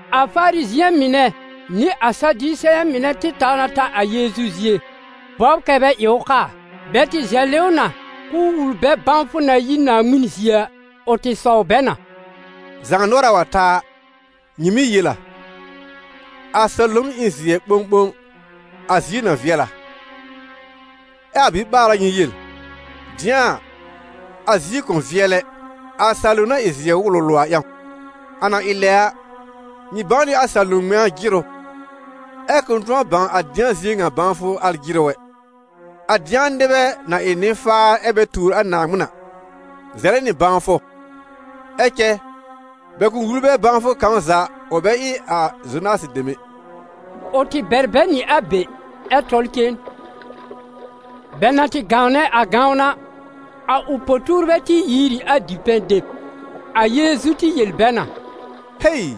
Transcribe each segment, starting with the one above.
A Farizɩ̃ɛ mɩnɛ nɩ a Sadiseyɛ̃ mɩnɛ tɩ taw na ta a Yeezu zie bɔbr kɛ́ bɛ ɩ ʋ kaa. Bɛ tɩ zɛlɩ ʋ na k'ʋʋ wul bɛ bãwfʋ na yi Naaŋmɩn zie a. Ʋ tɩ sɔw bɛ na: «Zaanʋɔra wa ta a, nyɩ mɩ́ yel a: ‹A salom ɩ n zɩɛ ɓõɓõ, a zie na vɩɛl a›; ɛ a biɓaara nyɩ yel: ‹Dɩ̃a a, a zie kʋ̃ vɩɛl ɛ, a salom na ɩ zɩɛ wʋlʋlʋ a ƴãw.› A na ɩ lɛ a, nyɩ bãw nɩ a salom ŋmɛ̃a jɩrʋ, ɛ kʋ̃ tʋ̃ɔ bãw a dɩ̃a zie ŋa bãwfʋ al jɩrʋ ɛ. A dɩ̃a nɩbɛ, na ɩ nɩ-faar ɛ bɛ tuur a Naaŋmɩn a, zɛlɛ nɩ bãwfʋ. Ɛ cɛ bɛ kʋ̃ wul bɛ bãwfʋ kãw za ʋ bɛ ɩ a Zonasɩ dem ɛ.» Ʋ tɩ bɛr bɛ nɩ a be ɛ tɔl cen. Bɛ na tɩ gãwnɛ a gãwn a, a ʋ po-tuurbɛ tɩ yiir ɩ a dipɛ̃ deb. A Yeezu tɩ yel bɛ na: «Hei!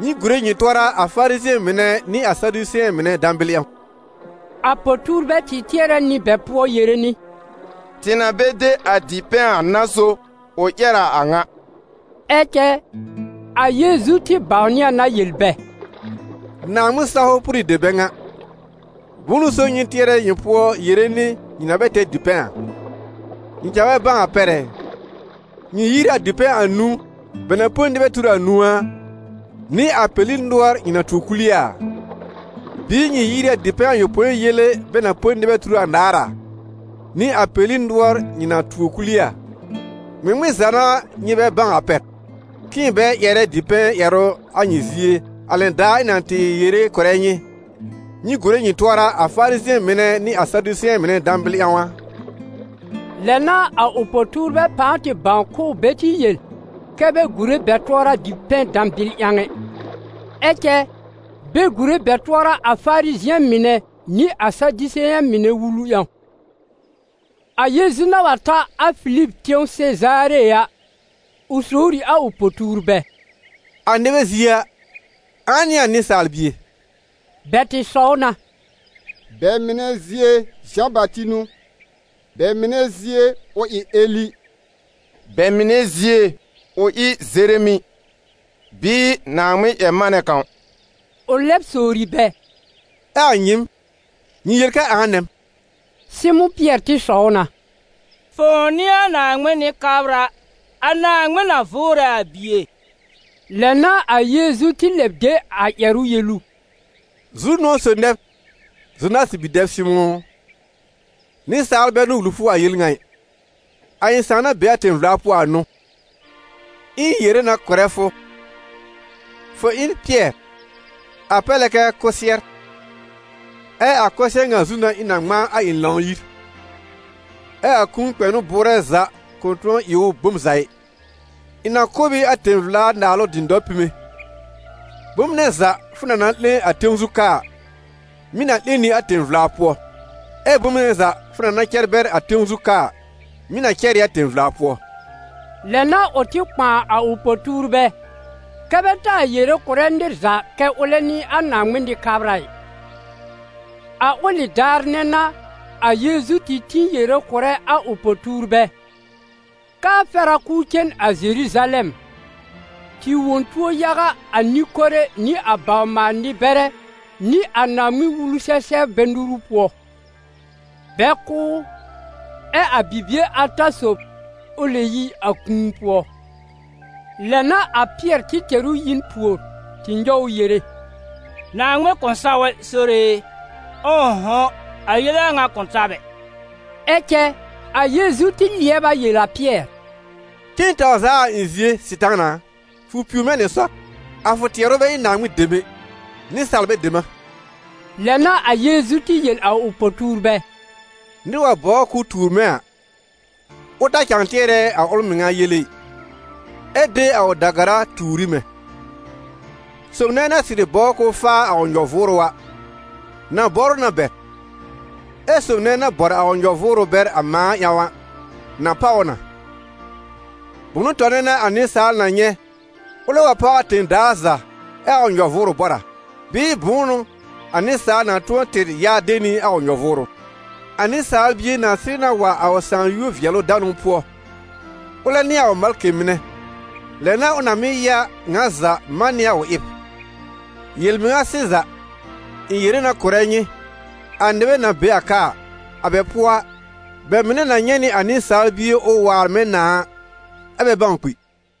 Nyɩ gùre nyɩ tʋɔra a Farizɩ̃ɛ mɩnɛ nɩ a Sadiseyɛ̃ mɩnɛ dãbɩl ƴãw.» A po-tuurbɛ tɩ tɩɛrɛ nɩ bɛ pʋɔ yere nɩ: «Tɩ na bɛ de a dipɛ̃ a n'a so ʋ ƴɛr a a ŋa.» Ɛ cɛ a Yeezu tɩ bãwnɩ a na yel bɛ: «Naaŋmɩn-sawfʋ pʋrɩ dem bɛ ŋa! Bʋ̃ʋ n'ʋ so nyɩ tɩɛrɛ nyɩ pʋɔ yere nɩ nyɩ na bɛ tɛr dipɛ̃ a? Nyɩ cãa bɛ bãw a pɛr ɛ? Nyɩ yiir ɩ a dipɛ̃ anũu bɛ na põ nɩbɛ tur anũu a, nɩ a peli nʋɔr nyɩ na tuo kul ɩ a? Bɩɩ nyɩ yiir ɩ a dipɛ̃ ayopõi yele bɛ na põ a nɩbɛ tur anaar a, nɩ a peli nʋɔr nyɩ na tuo kul ɩ a? Ŋmɩŋmɩn za n'a nyɩ bɛ bãw a pɛr, k'ɩ̃ɩ bɛ tɩ ƴɛrɛ dipɛ̃ ƴɛrʋ a nyɩ zie a lɛn daar ɩ̃ na tɩ yere kʋ̀rɛ nyɩ: nyɩ gùre nyɩ tʋɔra a Farizɩ̃ɛ mɩnɛ nɩ a Sadiseyɛ̃ mɩnɛ dãbɩl ƴãw a?» Lɛ n'a a ʋ po-tuurbɛ pãa tɩ bãw k'ʋʋ bɛ tɩ yel kɛ bɛ gùre bɛ tʋɔra dipɛ̃ dãbɩl ƴãw ɛ, ɛ cɛ bɛ gùre bɛ tʋɔra a Farizɩ̃ɛ mɩnɛ nɩ a Sadiseyɛ̃ mɩnɛ wulu ƴãw. A Yeezu na wa ta a Filib tẽw Sezaare a, ʋ sowr ɩ a ʋ po-tuurbɛ: «A nɩbɛ zie a, ãa n'ɩ a Nɩsaal Bie?» Bɛ tɩ sɔw na: «Bɛ mɩnɛ zie, Zã-Bati n'ʋ, bɛ mɩnɛ zie ʋ ɩ Eli, bɛ mɩnɛ zie ʋ ɩ Zeremi bɩɩ Naaŋmɩn-ƴɛr-manɛ kãw.» Ʋ lɛb sowri bɛ: «Ɛ a nyɩɩm, nyɩ yel kɛ ãa nɛ m?» Sɩmʋ̃ Pɩɛr tɩ sɔw na: «Fʋ̃ʋ n'ɩ a Naaŋmɩn Nɩ-kabra, a Naaŋmɩn na vʋʋrɛ a Bie.» Lɛ n'a a Yeezu tɩ lɛb de a ƴɛrʋ yel ʋ: «Zu-nʋ̃ɔ̀ sob nɛ b, Zonasɩ bi-dɛb Sɩmʋ̃ ʋ, nɩsaal bɛ n'ʋ wul fʋ a yel ŋa ɩ, a ɩ̃ Sãà na be a tẽ-vla pʋɔ a n'ʋ. Ɛ ɩ̃ yere na kʋ̀rɛ fʋ, fʋ ɩ n Pɩɛr, a pɛr lɛ kɛ kʋsɩɛr, ɛ a kʋsɩɛr ŋa zu n'a ɩ̃ na ŋmãa a ɩ̃ Lãw-yir, ɛ a kũu kpɛnʋ bʋʋrɛ za kʋ̃ tʋ̃ɔ ɩ ʋ bom za ɩ. Ɩ̃ na kʋ̀ b ɩ a tẽ-vla-Naalʋ dɩ̃dɔr pime: bom nɛ za fʋ na na 'lẽ a tẽw zu ka a, mɩ̀ na 'lẽ nɩ a tẽ-vla pʋɔ; ɛ bom nɛ za fʋ na na cɛr bɛr a tẽw zu ka a, mɩ̀ na cɛr ɩ a tẽ-vla pʋɔ.» Lɛ n'a ʋ tɩ kpãa a ʋ po-tuurbɛ kɛ́ bɛ taa yere kʋ̀rɛ nɩr za kɛ́ ʋlɛ n'ɩ a Naaŋmɩn Nɩ-kabra ɩ. A ʋlɩ daar nɛ n'a a Yeezu tɩ tĩ yere kʋ̀rɛ a ʋ po-tuurbɛ, k'aa fɛr a k'ʋʋ cen a Zeruzalɛm, tɩ wõ tuo yaga a nɩ-kore nɩ a bawr-maal-nɩ-bɛrɛ nɩ a Naaŋmɩn-Wulu-sɛ-sɛbrbɛ nuru pʋɔ, bɛ kʋ́ ʋ, ɛ a bibie ata sob ʋ lɛb yi a kũu pʋɔ. Lɛ n'a a Pɩɛr tɩ tɛr ʋ yi n pùor tɩ nyɔw ʋ yere: «Naaŋmɩn kʋ̃ saw ɛ, Sore e! Ʋ̃ʋ'hʋ̃, a yele a ŋa kʋ̃ ta b ɛ!» Ɛ cɛ a Yeezu tɩ lɩɛb a yel a Pɩɛr: «Cen taw zaa a ɩ̃ zie, Sɩtaana a! Fʋ piwr mɛ̃ nɩ sɔr. A fʋ tɩɛrʋ bɛ ɩ Naaŋmɩn dem ɛ, nɩsaalbɛ dem a.» Lɛ n'a a Yeezu tɩ yel a ʋ po-tuurbɛ: «Nɩr wa bɔbr k'ʋʋ tuur mɛ̃ a, ʋ ta cãa tɩɛrɛ a ʋl mɩŋa yele ɩ, ɛ de a ʋ da-gara tuur ɩ mɛ̃. Sob nɛ na sɩrɩ bɔbr k'ʋʋ faa a ʋ nyɔ-vʋʋrʋ a, na bɔr ʋ na bɛr; ɛ sob nɛ na bɔr a ʋ nyɔ-vʋʋrʋ bɛr a mãa ƴãw a, na páw ʋ na. Bʋnʋ tɔnɛ n'a a nɩsaal na nyɛ̃, ʋlɛ wa páw a tẽ-daa za ɛ a ʋ nyɔ-vʋʋrʋ bɔr a? Bɩɩ bʋ̃ʋ n'ʋ a nɩsaal na tʋ̃ɔ tɩr ya de nɩ a ʋ nyɔ-vʋʋrʋ? A Nɩsaal Bie na sɩrɩ na wa a ʋ Sãà yúor-vɩɛlʋ-danʋ pʋɔ, ʋlɛ nɩ a ʋ malkɩ mɩnɛ, lɛ n'a ʋ na mɩ́ ya ŋa za man nɩ a ʋ ɩb. Yel-mɩŋa sɩza, ɩ̃ yere na kʋ̀rɛ nyɩ, a nɩbɛ na be a ka a, a bɛ pʋɔ a, bɛ mɩnɛ na nyɛ̃ nɩ a Nɩsaal Bie ʋ waar mɛ̃ nãà a, ɛ́ bɛ bãw kpi.»